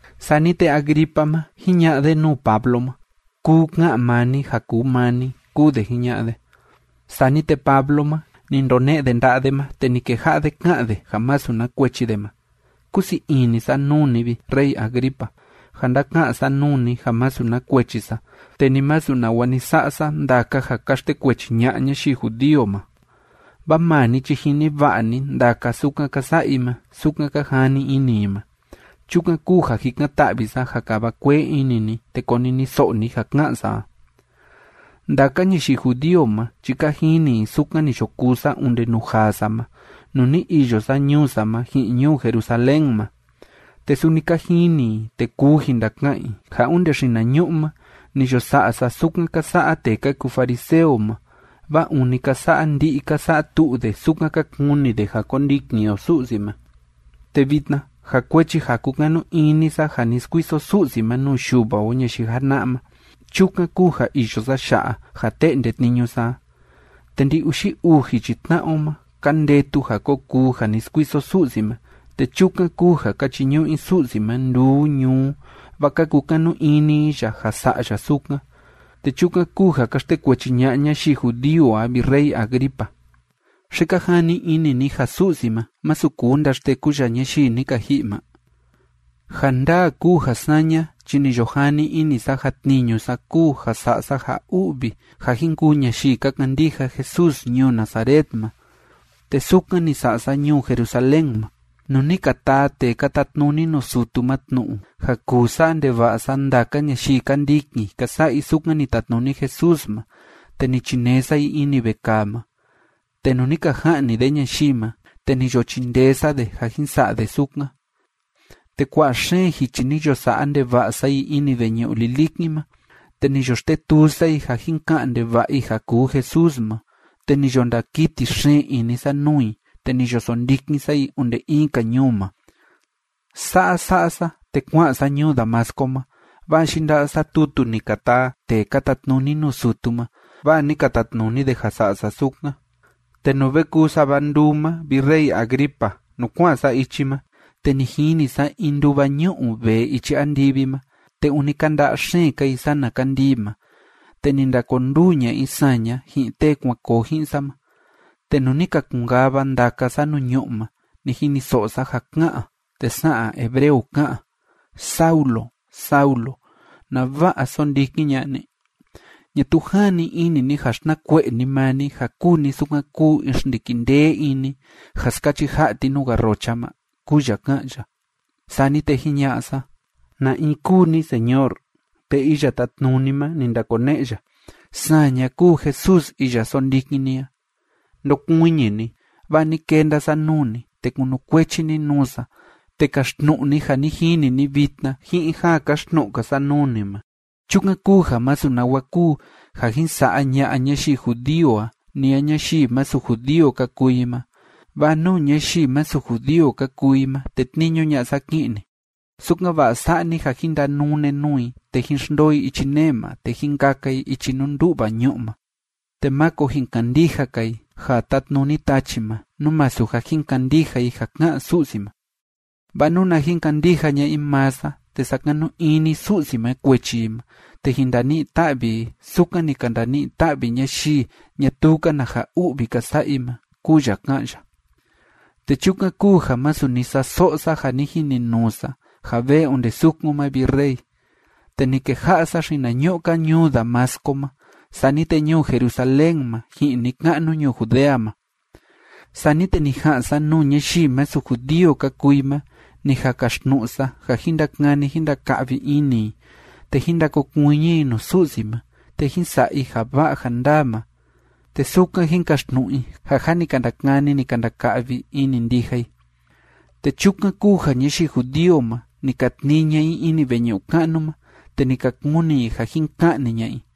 Sani te Agripa ma, jiña'a de nuu Pablo ma: ―Kuu ka'an maa ni ja kuu maa ni ―kúu de jiña'a de. Sani te Pablo ma, ni ndone'e de nda'a de ma, te ni keja'a de ká'an de ja masu na kuechi de ma: ―Kúsii ini sa nuu ni, vi rey Agripa, ja ndáka'an sa nuu ni ja masu na kuechi sa, te ni masu nawa ni sa'a sa ndaka ja ka xtekuechi ña'a ñayii judío ma. Vaa maa ni chi jini va'a ni ndaka sukan ka sa'a i ma sukan ka jani ini i ma. Chukan kúu ja jikan‑ta'vi sa ja kava kuee ini ni, te koniniso'o ni ja ka'an sa a. ’Ndaka ñayii judío ma chi ka jini i sukan ni yo kuu sa onde nuu jaa sa ma, nuu ni iyo sa ñuu sa ma ji'in ñuu Jerusalén ma. Te suni ka jini i, te kuu jin ndaka'an i, ja onde xinañu'u ma ni yo sa'a sa sukan ka sa'a tee ka kuu fariseo ma, vaa ûni ka sa'a ndi'i, ka sa'a tu'u de sukan ka kuni de ja kondikin o Su'si ma. Te vitna, ja kuechi ja kúkanu ini sa ja ni skuiso Su'si ma nuu yuva o ñayii jana'a ma, chukan kúu ja iyo sa ya'a, ja te'nde tniñu sa a. Te ndi‑uxi uu jichi tna'a o ma ka ndetu ja ko kuu ja ni skuiso Su'si ma, te chukan kúu ja ka chiñu'u i Su'si ma nduu ñuu, vaa ka kukanu ini i ya ja sa'a ya sukan. Te chukan kúu ja ka xtekuechi ña'a ñayii judío a, vi rey Agripa. ¿Xi ka jani ini ni ja Su'si ma, masu kuu ndaxteku ya ñayii ni ka ji'i ma? ’Ja ndaa kúu ja saña chi ni yo jani ini sa ja tniñu sa kúu ja sa'a sa ja u'vi ja jin kuu ñayii ka kandija Jesús ñuu Nazaret ma. Te sukan ni sa'a sa ñuu Jerusalén ma. Nuu ni ka taa tee ka tatnuni nuu sutu ma tnu'u ja kuu sa'a ndeva'a sa ndaka ñayii ka ndikin ka sa'a i sukan ni tatnuni Jesús ma, te ni chinee sa i ini vekaa ma. Te nuu ni ka ja'ni de ñayii ma, te ni yo chindee sa de ja jin sa'a de sukan. Te kua'a xeen jichi ni yo sa'a ndeva'a sa i ini veñu'u lilikin ma, te ni yo xtetuu sa i ja jin ka'an ndeva'a i ja kuu Jesús ma. Te ni yo ndakiti xeen ini sa nuu i, te ni yo sondikin sa i onde in‑ka ñuu ma. ’Sa'a sa'a sa, te kua'an sa ñuu Damasco ma, vaa yinda'a sa tutu ni ka taa tee ka tatnuni nuu sutu ma, vaa ni ka tatnuni de ja sa'a sa sukan. Te nuu ve kuu sava nduu ma, vi rey Agripa, nuu kua'an sa ichi ma, te ni jini sa in nduva ñu'u vee ichi andivi ma, te ûni kánda'a xeen‑ka i sana kandii ma, te ni ndakonduu ña'a i saña ji'in tee kuan koo ji'in sa ma. Te nuu ni ka kun‑kava ndaka sa nuu ñu'ú ma, ni jiniso'o sa ja ká'an, te sa'an hebreo ká'an: “Saulo, Saulo, ¿nava'a sóndikin ña'a ni? ¿Ñatuu jani ini ni ja xtnakue'e ni maa ni, ja kúu ni sukan kúu in xndiki ndee ini ja skachi ja'a ti nuu garrocha ma?”, kúu ya ká'an ya. Sani te jiña'a sa: “¿Na in kúu ni, Señor?” Te Iya Tátnuni ma, ni ndakone'e ya: “Saña kúu Jesús iya sóndikin ni a. Ndokuiñi ni, vaa ni kenda sa nuu ni, te kunukuechi ni nuu sa, te kaxtnu'u ni ja ni jini ni vitna ji'in ja kaxtnu'u‑ka sa nuu ni ma. Chukan kúu ja masu nawa kuu ja jin sa'a ña'a ñayii judío a ni a ñayii masu judío ka kuu i ma, vaa nuu ñayii masu judío ka kuu i ma tetniñu ña'a sa ki'in ni, sukan‑va'a sa'a ni ja jín ndanune nuu i, te jín xndoo i ichi nee ma, te jín kaka i ichi nuu ndú'va ñu'u ma, te máko jin kandija‑ka i ja tátnuni tachi ma, nú masu ja jin kandija i ja ká'an Su'si ma. Vaa nuna jin kandija ña'a i maa sa, te sakanu ini Su'si ma kuechi i ma, te jin ndani'i ta'vi i sukan ni ka ndani'i ta'vi ñayii ñatuu‑ka na ja u'vi ka sa'a i ma”, kúu ya ká'an ya. Te chukan kúu ja masu ni sa'a so'o sa ja ni jininuu sa ja vee onde sukun ma, vi rey. Te ni keja'a sa xinañu'u‑ka ñuu Damasco ma, sani te ñuu Jerusalén ma ji'in ni‑ka'nu ñuu Judea ma. Sani te ni ja'an sa nuu ñayii masu judío ka kuu i ma, ni jan kaxtnu'u sa ja jín ndakani jín ndaka'vi ini i, te jín ndakokuiñi i nuu Su'si ma, te jín sa'a i ja va'a ja ndaa ma, te sukan jín kaxtnu'u i ja jâ ni ka ndakani, ni ka ndaka'vi ini ndija i. Te chukan kúu ja ñayii judío ma, ni ka tnii ña'a i ini veñu'u ka'nu ma, te ni ka kuni i ja jin ka'ni ña'a i.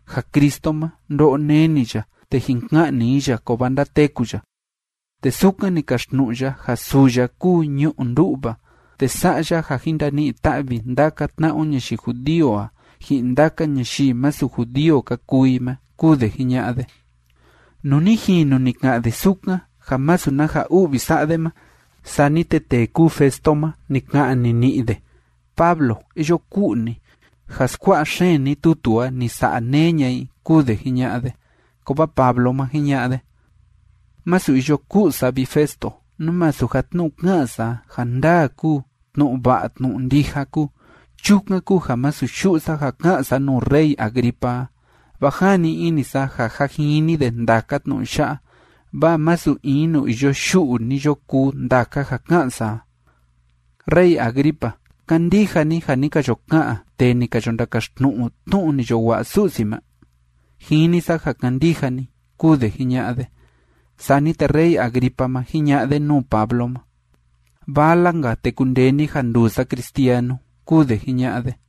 ja Cristo ma, ndo'o neni ya, te jin ka'ni i ya, kovaa ndateku ya. Te sukan ni kaxtnu'u ya ja suu ya kúu ñu'u ndú'va, te sa'a ya ja jin ndani'i ta'vi ndaka tna'a o ñayii judío a, ji'in ndaka ñayii masu judío ka kuu i ma ―kúu de jiña'a de. Nuu ni jinu ni ka'an de sukan, ja masu na ja u'vi sa'a de ma, sani te tee kúu Festo ma, ni ka'an nini'i de: ―Pablo, iyo ku'u ni. Ja skua'a xeen ni tutu a, ni sa'a neé ña'a i ―kúu de jiña'a de. Kovaa Pablo ma, jiña'a de: ―Masu iyo ku'u sa, vi Festo, nú masu ja tnu'u ká'an sa a, ja ndaa kúu, tnu'u va'a tnu'u ndija kúu. Chukan kúu ja masu yu'u sa ja ká'an sa nuu rey Agripa a, vaa jani ini sa ja jâ jini de ndaka tnu'u ya'a, vaa masu in nuu iyo yu'u ni yo kuu ndaka ja ká'an sa a. Rey Agripa, ¿kándija ni ja ni ka yo ka'an tee ni ka yo ndakaxtnu'u tnu'u ni yo wa'a Su'si ma? Jini sa ja kándija ni ―kúu de jiña'a de. Sani te rey Agripa ma, jiña'a de nuu Pablo ma: ―Vala‑nka, te kundee ni ja nduu sa cristianu ―kúu de jiña'a de.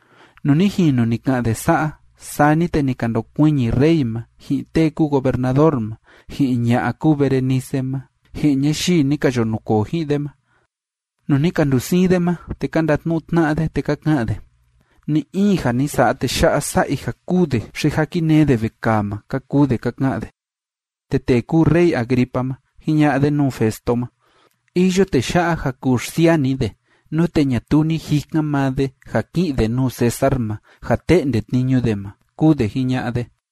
Nuu ni jinu ni ka'an de sa'a, sani te ni ka ndokuiñi rey ma, ji'in tee kúu gobernador ma, ji'in ña'a kúu Berenice ma, ji'in ñayii ni ka yo nukoo ji'in de ma. Nuu ni ka ndusiin de ma, te ka ndatnu'u tna'a de, te ka ka'an de: ―Ni‑in ja ni sa'a tee ya'a sa'a i ja kûu de xi ja kinee de vekaa ma ―ka kuu de ka ka'an de. Te tee kúu rey Agripa ma, jiña'a de nuu Festo ma: ―Iyo tee ya'a ja kuu xsiaa ni de, nute ñatuu ni jikan maa de ja ki'in de nuu César ma ja te'nde tniñu de ma ―kúu de jiña'a de.